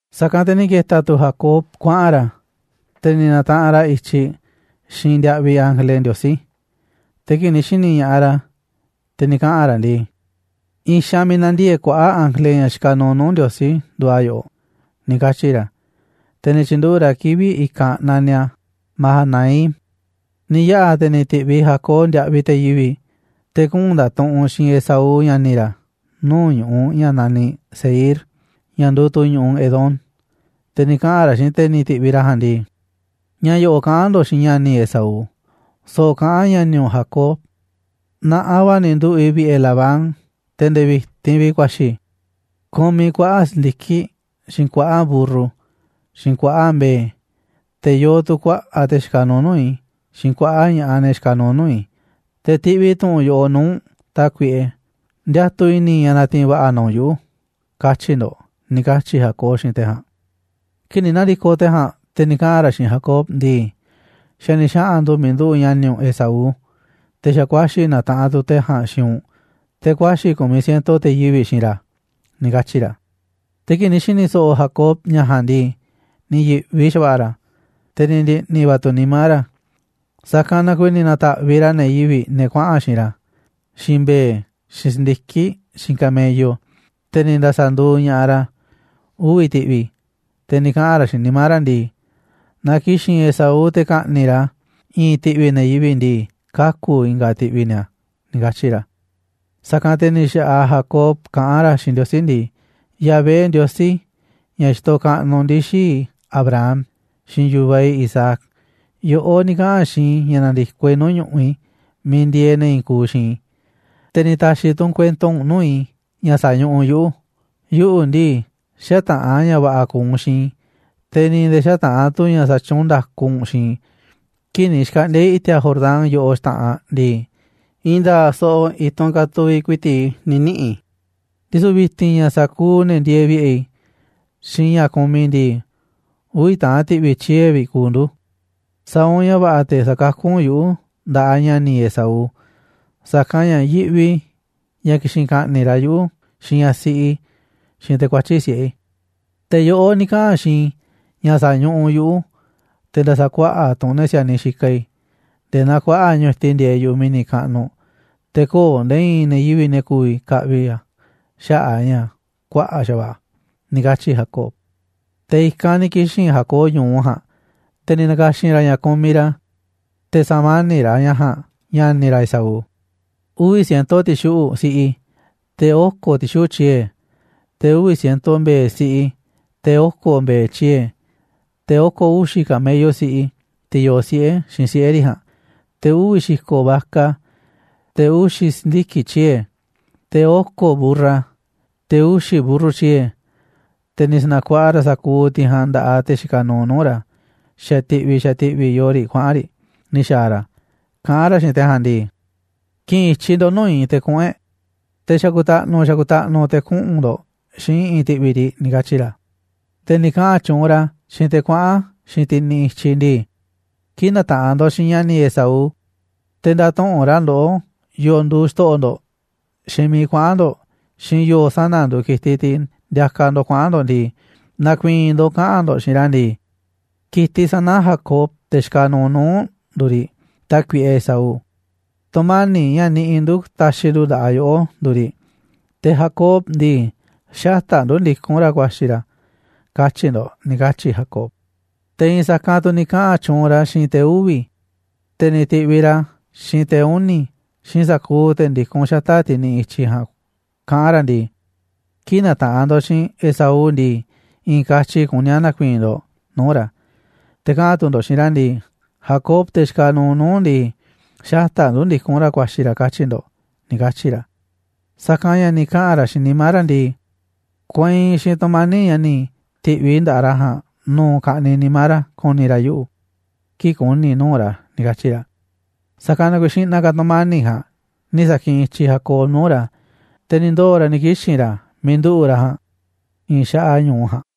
Sa̱kanꞌ te̱ ni̱ ke̱ta̱ tu̱ Jacob kuaꞌa̱n ra̱, te̱ ni̱ na̱taꞌanꞌ ra̱ i̱tyiꞌ xiinꞌ ndiaꞌviꞌ ángele Ndiosí. Te̱ kii̱ꞌ ni̱ xi̱ni̱ ña̱ꞌaꞌ ra̱, te̱ ni̱ kaꞌa̱n ra̱ ndii: ―I̱i̱n xaanꞌ miiꞌ na̱ndiee̱ꞌ kuaꞌa̱ꞌ ángele, ña̱ xikaꞌ nuuꞌ nuu̱ꞌ Ndiosí, nduuꞌ a̱ yoꞌoꞌ ―ni̱ katyi̱ ra̱. Te̱ ni̱ tyi̱nduꞌu̱ꞌ ra̱ kivi̱ꞌ i̱kanꞌ naniꞌ a̱ Mahanaim. Ni̱ yaꞌa̱ te̱ ni̱ ti̱ꞌviꞌ Jacob ndiaꞌviꞌ te̱ yivi̱ꞌ, te̱ kuꞌu̱n nda̱tuꞌunꞌ xiinꞌ Esaú, ña̱ni̱ ra̱, nuu̱ꞌ ñu̱ꞌuꞌ ña̱ naniꞌ Seir, ña̱ nduuꞌ tu̱ ñu̱ꞌuꞌ Edom. Te̱ ni̱ kaꞌa̱n ra̱ xiinꞌ te̱ ni̱ ti̱ꞌviꞌ ra̱ ja̱a̱nꞌ ndii: ―Ña̱ yo̱ꞌo̱ kaꞌa̱n ndo̱ꞌ xiinꞌ ña̱ni̱ i̱ Esaú: “So̱ꞌo̱ kaꞌán ña̱ni̱ u̱nꞌ Jacob: ‘Na̱ꞌanꞌ va̱ ni̱ nduꞌu̱ꞌ i̱ vi̱ꞌe̱ Labán, te̱ nde̱e̱ vi̱ti̱n vi̱ꞌ ku̱a̱xi̱ i̱. Kumiꞌ i̱ kuaꞌa̱ꞌ si̱ndiki̱ꞌ, xiinꞌ kuaꞌa̱ꞌ mburru, xiinꞌ kuaꞌa̱ꞌ mbe̱e̱, te̱ yoo tu̱ kuaꞌa̱ꞌ te̱ xikaꞌ nuuꞌ nuu̱ꞌ i̱, xiinꞌ kuaꞌa̱ꞌ ña̱ꞌaꞌ, ne̱ xikaꞌ nuuꞌ nuu̱ꞌ i̱, te̱ tiꞌviꞌ i̱ tu̱ꞌu̱n yoꞌoꞌ nuu̱ꞌ u̱nꞌ, tákuiꞌe, ndiatuꞌ i̱ni̱ i̱ ña̱ na̱ti̱i̱n va̱ꞌa̱ na u̱nꞌ yuꞌu̱.”, katyi̱ ndo̱ꞌ ―ni̱ katyi̱ Jacob xiinꞌ te̱ ja̱a̱nꞌ. Kii̱ꞌ ni̱ na̱ndi̱koꞌ te̱ ja̱a̱nꞌ, te̱ ni̱ kaꞌa̱n ra̱ xiinꞌ Jacob ndii: ―Xa̱ ni̱ xaꞌa̱n ndu̱ miiꞌ nduꞌu̱ꞌ ña̱ni̱ u̱nꞌ Esaú, te̱ xa̱ kuaxi̱ na̱taꞌanꞌ tu̱ te̱ ja̱a̱nꞌ xiinꞌ u̱nꞌ, te̱ kuaxi̱ ku̱miꞌ ciento te̱ yivi̱ꞌ xiinꞌ ra̱ ―ni̱ katyi̱ ra̱. Te̱ kii̱ꞌ ni̱ xi̱ni̱ so̱ꞌo̱ Jacob ña̱ ja̱a̱nꞌ ndii, ni̱ yi̱ꞌvi xa̱va̱ꞌa̱ ra̱, te̱ ni̱ ndi̱ꞌni̱ va̱ tu̱ nimá ra̱, sa̱kanꞌ na kuiiꞌ ni̱ na̱ta̱ꞌviꞌ ra̱ ne̱ yivi̱ꞌ, ne̱ kuaꞌa̱n xiinꞌ ra̱, xiinꞌ mbe̱e̱, xiinꞌ si̱ndiki̱ꞌ, xiinꞌ camello, te̱ ni̱ nda̱sa̱nduuꞌ ña̱ꞌaꞌ ra̱ uvi̱ ti̱ꞌvi̱. Te̱ ni̱ kaꞌa̱n ra̱ xiinꞌ nimá ra̱ ndii: “Naaꞌ ki̱xi̱n Esaú te̱ ka̱ꞌni̱ꞌ ra̱ i̱i̱n ti̱ꞌvi̱ ne̱ yivi̱ꞌ ndii, kaku̱ i̱nga̱ ti̱ꞌvi̱ ni̱a̱”, ni̱ katyi̱ ra̱. Sa̱kanꞌ te̱ ni̱ xa̱ꞌaꞌ Jacob kaꞌán ra̱ xiinꞌ Ndiosí ndii: ―Yahvé, Ndiosí ña̱ xitoꞌ kaꞌnuꞌ ndii̱ xii̱ꞌ i̱ Abraham, xiinꞌ yu̱vaꞌ i̱ Isaac, yoꞌó ni̱ kaꞌa̱n xiinꞌ i̱ ña̱ na̱ndi̱koꞌ i̱ nuu̱ꞌ ñu̱ꞌuꞌ i̱ miiꞌ ndieeꞌ ne̱ i̱i̱n kuuꞌ xiinꞌ i̱, te̱ ni̱ ta̱xi̱ tu̱ u̱nꞌ kuento nuu̱ꞌ i̱ ña̱ sa̱ñuꞌuꞌ u̱nꞌ yuꞌu̱. Yuꞌu̱ ndii, xätaꞌa̱n ña̱ va̱ꞌa̱ ku̱u̱ u̱nꞌ xiinꞌ i̱, te̱ ni̱ nde̱e̱ xätaꞌa̱n tu̱ ña̱ xatyuunꞌ nda̱ku u̱nꞌ xiinꞌ i̱. Kii̱ꞌ ni̱ xkaꞌndi̱a̱ i̱ i̱ti̱a̱ Jordán yoꞌoꞌ xta̱ꞌanꞌ ndii, i̱i̱n nda̱a̱ꞌ so̱ꞌo̱ i̱tunꞌ katuviꞌ ku̱i̱ti̱ꞌ i̱ ni̱ niꞌi̱ i̱, ndisu̱ vi̱ti̱n ña̱ sa̱kuuꞌ ne̱ ndieeꞌ vi̱ꞌe̱ i̱, xiinꞌ ña̱ kumiꞌ i̱ ndii, uvi̱ taꞌan ti̱ꞌvi̱ tyie̱ vi̱ꞌ kuuꞌ ndu̱. Sa̱a̱ u̱nꞌ ña̱ va̱ꞌa̱ te̱ sa̱kakú u̱nꞌ yuꞌu̱ nda̱ꞌaꞌ ña̱ni̱ i̱ Esaú, sa̱kanꞌ ña̱ yiꞌvi i̱ ña̱ ki̱xi̱n ka̱ꞌni̱ꞌ ra̱ yuꞌu̱, xiinꞌ ñaꞌ siꞌi i̱, xiinꞌ te̱ kuatyi̱ꞌ siꞌe̱ i̱. Te̱ yoꞌó ni̱ kaꞌa̱n xiinꞌ i̱ ña̱ sa̱ñuꞌuꞌ u̱nꞌ yuꞌu̱, te̱ nda̱sa̱kuaꞌa̱ꞌ tu̱ u̱nꞌ ne̱ si̱a̱niꞌ xikaꞌ i̱, nde̱e̱ naa kuaꞌa̱ꞌ ñu̱tiꞌ ndieeꞌ yu̱ꞌuꞌ mi̱ni̱ kaꞌnuꞌ, te̱ köo̱ꞌ nde̱e̱ i̱i̱n ne̱ yivi̱ꞌ ne̱ ku̱vi̱ ka̱ꞌvi̱ a̱ xaꞌa̱ꞌ a̱ ña̱ kuaꞌa̱ꞌ xa̱va̱ꞌa̱ a̱ ―ni̱ katyi̱ Jacob. Te̱ i̱kanꞌ ni̱ kixi̱n Jacob ñu̱u ja̱a̱nꞌ, te̱ ni̱ na̱ka̱xi̱n ra̱ ña̱ kumiꞌ ra̱, te̱ sa̱mani̱ꞌ ra̱ ña̱ ja̱a̱nꞌ ña̱ni̱ ra̱ Esaú. Uvi̱ ciento ti̱xuꞌu̱ꞌ siꞌi, te̱ oko̱ ti̱xuꞌu̱ꞌ tyie̱, te̱ uvi̱ ciento mbe̱e̱ siꞌi, te̱ oko̱ mbe̱e̱ tyie̱, te̱ oko̱ uxi̱ camello siꞌi, tiꞌ yoo siꞌe̱ xiinꞌ siꞌe̱ riꞌ ja̱a̱nꞌ, te̱ uvi̱ xi̱ko̱ vaca, te̱ uxi̱ si̱ndiki̱ꞌ tyie̱, te̱ oko̱ mburra, te̱ uxi̱ mburru tyie̱. Te̱ ni̱ sa̱na̱kuaꞌa ra̱ sa̱kuuꞌ tiꞌ ja̱a̱nꞌ nda̱ꞌaꞌ te̱ xikaꞌ nuuꞌ nuu̱ꞌ ra̱, xa̱ ti̱ꞌvi̱ xa̱ ti̱ꞌvi̱ yoo riꞌ kuaꞌa̱n riꞌ ni̱ xa̱a̱ ra̱, kaꞌán ra̱ xiinꞌ te̱ ja̱a̱nꞌ ndii: ―Ki̱ꞌi̱n i̱tyiꞌ ndo̱ꞌ nuu̱ꞌ i̱ te̱ kuꞌu̱n e̱ꞌ, te̱ xa̱ku̱ta̱ꞌnu̱ xa̱ku̱ta̱ꞌnu̱ te̱ kuꞌu̱n ndo̱ꞌ xiinꞌ i̱ꞌi̱n ti̱ꞌvi̱ riꞌ ―ni̱ katyi̱ ra̱. Te̱ ni̱ kaꞌa̱n tyuunꞌ ra̱ xiinꞌ te̱ kuaꞌa̱n xiinꞌ tiꞌ niꞌiꞌ i̱tyiꞌ ndii: ―Kii̱ꞌ na̱taꞌanꞌ ndo̱ꞌ xiinꞌ ña̱ni̱ i̱ Esaú, te̱ nda̱tuꞌu̱nꞌ ra̱ ndoꞌó yo̱o̱ nduuꞌ xto̱ꞌo̱ ndo̱ꞌ, xiinꞌ miiꞌ kuaꞌa̱n ndo̱ꞌ, xiinꞌ yo̱o̱ sana̱ nduuꞌ ki̱tiꞌ tiꞌ ndiakaꞌ ndo̱ꞌ kuaꞌa̱n ndo̱ꞌ ndii, na̱ku̱i̱i̱n ndo̱ꞌ kaꞌa̱n ndo̱ꞌ xiinꞌ ra̱ ndii: “Ki̱tiꞌ sana̱ Jacob, te̱ xikaꞌ nuuꞌ nuu̱ꞌ u̱nꞌ, nduuꞌ riꞌ, tákuiꞌe Esaú, tu̱mani̱ꞌ ña̱ niꞌiꞌ ndu̱ ta̱xi̱ ndu̱ nda̱ꞌaꞌ yoꞌó nduuꞌ riꞌ, te̱ Jacob ndii, xata̱ꞌ ndu̱ ndikún ra̱ ku̱a̱xi̱ ra̱”, katyi̱ ndo̱ꞌ ―ni̱ katyi̱ Jacob. Te̱ i̱i̱n sa̱kanꞌ tu̱ ni̱ kaꞌa̱n tyuunꞌ ra̱ xiinꞌ te̱ uvi̱, te̱ ni̱ ti̱ꞌviꞌ ra̱ xiinꞌ te̱ uni̱, xiinꞌ sa̱kuuꞌ te̱ ndikún xata̱ꞌ tiꞌ niꞌiꞌ i̱tyiꞌ ja̱a̱nꞌ, kaꞌán ra̱ ndii: ―Kii̱ꞌ na̱taꞌanꞌ ndo̱ꞌ xiinꞌ Esaú ndii, i̱i̱n katyi kuní a̱ na̱ku̱i̱i̱n ndo̱ꞌ nuu̱ꞌ ra̱, te̱ kaꞌa̱n tu̱ ndo̱ꞌ xiinꞌ ra̱ ndii: “Jacob, te̱ xikaꞌ nuuꞌ nuu̱ꞌ u̱nꞌ ndii, xata̱ꞌ ndu̱ ndikún ra̱ ku̱a̱xi̱ ra̱”, katyi̱ ndo̱ꞌ ―ni̱ katyi̱ ra̱. Sa̱kanꞌ ña̱ ni̱ kaꞌa̱n ra̱ xiinꞌ nimá ra̱ ndii: “Kuainꞌ xiinꞌ tu̱mani̱ꞌ ña̱ ni̱ ti̱ꞌviꞌ i̱ nda̱ꞌaꞌ ra̱ ja̱a̱nꞌ nu̱u̱ ka̱ꞌniꞌ nimá ra̱ ku̱ni̱ ra̱ yuꞌu̱, kii̱ꞌ ku̱ni̱ i̱ nuu̱ꞌ ra̱”, ni̱ katyi̱ ra̱. Sa̱kanꞌ na kuiiꞌ xi̱ꞌna̱ ka̱ tu̱mani̱ꞌ ja̱a̱nꞌ ni̱ sa̱kiꞌinꞌ i̱tyiꞌ Jacob nuu̱ꞌ ra̱, te̱ ni̱ ndoo̱ ra̱ ni̱ kixi̱n ra̱ miiꞌ nduꞌu̱ꞌ ra̱ ja̱a̱nꞌ i̱i̱n xaꞌaꞌ ñu̱u ja̱a̱nꞌ.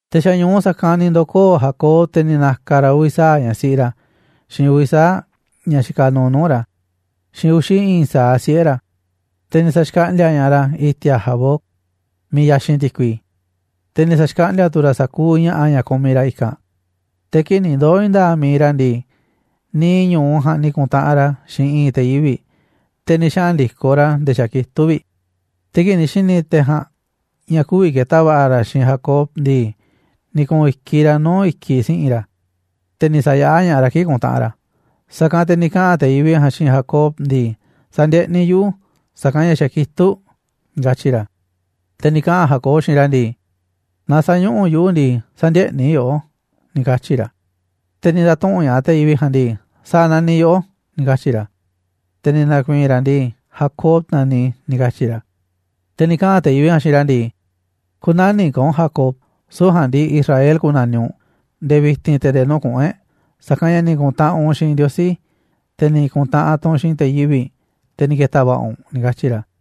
Te̱ xa̱ ñu̱u sa̱kanꞌ ni̱ ndo̱koo̱ Jacob, te̱ ni̱ na̱ka̱ ra̱ uvi̱ sa̱aꞌ ñaꞌ siꞌi ra̱, xiinꞌ uvi̱ sa̱aꞌ ñaꞌ xikaꞌ nuuꞌ nuu̱ꞌ ra̱, xiinꞌ uxi̱ i̱i̱n sa̱aꞌ siꞌe̱ ra̱, te̱ ni̱ sa̱xkaꞌndi̱a̱ ña̱ꞌaꞌ ra̱ i̱ti̱a̱ Jaboc, miiꞌ yaxinꞌ ti̱kui, te̱ ni̱ sa̱xkaꞌndi̱a̱ tu̱ ra̱ sa̱kuuꞌ ña̱ꞌa̱ ña̱ kumiꞌ ra̱ i̱kanꞌ. Te̱ kii̱ꞌ ni̱ ndoo̱ i̱i̱n nda̱a̱ꞌ mi̱iꞌ ra̱ ndii, niiꞌ ñu̱u ja̱a̱nꞌ ni̱ ku̱ntaꞌanꞌ ra̱ xiinꞌ i̱i̱n te̱ yivi̱ꞌ, te̱ ni̱ xaꞌa̱n ndi̱koꞌ ra̱ nde̱e̱ xa̱ kitúꞌ vi̱ꞌ. Te̱ kii̱ꞌ ni̱ xi̱ni̱ te̱ ja̱a̱nꞌ ña̱ kü̱vi̱ ke̱ta̱ va̱ꞌa̱ ra̱ xiinꞌ Jacob ndii, ni̱ ku̱u̱n i̱kiꞌ ra̱ nuu̱ꞌ i̱kiꞌ si̱ꞌi̱n ra̱, te̱ ni̱ sa̱yaꞌá ña̱ꞌaꞌ ra̱ kii̱ꞌ kuntaꞌanꞌ ra̱. Sa̱kanꞌ te̱ ni̱ kaꞌa̱n te̱ yivi̱ꞌ ja̱a̱nꞌ xiinꞌ Jacob ndii: ―Sa̱ndieꞌniꞌ yuꞌu̱, sa̱kanꞌ ña̱ xa̱ kitúꞌ ―ni̱ katyi̱ ra̱. Te̱ ni̱ kaꞌa̱n Jacob xiinꞌ ra̱ ndii: ―Naaꞌ sä̱ñuꞌuꞌ u̱nꞌ yuꞌu̱ ndii, sä̱ndieꞌniꞌ i̱ yoꞌó ―ni̱ katyi̱ ra̱. Te̱ ni̱ nda̱tuꞌu̱nꞌ ña̱ꞌaꞌ te̱ yivi̱ꞌ ja̱a̱nꞌ ndii: ―¿Sa̱a̱ naniꞌ yoꞌó ―ni̱ katyi̱ ra̱. Te̱ ni̱ na̱ku̱i̱i̱n ra̱ ndii: ―Jacob naniꞌ i̱ ―ni̱ katyi̱ ra̱. Te̱ ni̱ kaꞌa̱n te̱ yivi̱ꞌ ja̱a̱nꞌ xiinꞌ ra̱ ndii: ―Kü̱na̱niꞌ ka̱ u̱nꞌ Jacob, süu̱ꞌ ja̱a̱nꞌ ndii, Israel ku̱na̱niꞌ u̱nꞌ nde̱e̱ vi̱ti̱n te̱ nde̱e̱ nuu̱ꞌ kuꞌu̱n e̱ꞌ, sa̱kanꞌ ña̱ ni̱ ku̱ntaꞌanꞌ u̱nꞌ xiinꞌ Ndiosí, te̱ ni̱ ku̱ntaꞌanꞌ tu̱ u̱nꞌ xiinꞌ te̱ yivi̱ꞌ, te̱ ni̱ ke̱ta̱ va̱ꞌa̱ u̱nꞌ ―ni̱ katyi̱ ra̱.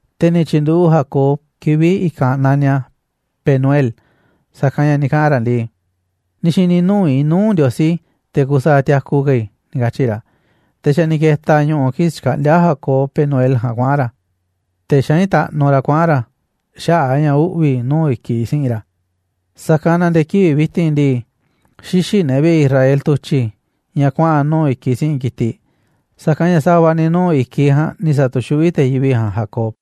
Te̱ ni̱ tyi̱nduꞌu̱ꞌ Jacob kivi̱ꞌ i̱kanꞌ naniꞌ a̱ Penuel, sa̱kanꞌ ña̱ ni̱ kaꞌa̱n ra̱ ndii: ―Ni̱ xi̱ni̱ nuu̱ꞌ i̱ nuu̱ꞌ Ndiosí, te̱ kusaaꞌ tiaku ka̱ i̱ ―ni̱ katyi̱ ra̱. Te̱ xa̱ ni̱ ke̱ta̱ ñu̱ꞌu̱ kii̱ꞌ xkaꞌndíá Jacob Penuel ja̱a̱nꞌ kuaꞌa̱n ra̱, te̱ xaín taꞌnu ra̱ kuaꞌa̱n ra̱ xaꞌa̱ꞌ a̱ ña̱ uꞌvi̱ nuu̱ꞌ i̱kiꞌ si̱ꞌi̱n ra̱. Sa̱kanꞌ na nde̱e̱ kivi̱ꞌ vi̱ti̱n ndii, xïxiꞌ ne̱ vi̱ꞌe̱ Israel tu̱tyi̱ ña̱ kuaꞌa̱n nuu̱ꞌ i̱kiꞌ si̱ꞌi̱n ki̱tiꞌ. Sa̱kanꞌ ña̱ sa̱va̱ ni̱ nuu̱ꞌ i̱kiꞌ ja̱a̱nꞌ ni̱ sa̱tu̱xuꞌví te̱ yivi̱ꞌ ja̱a̱nꞌ Jacob.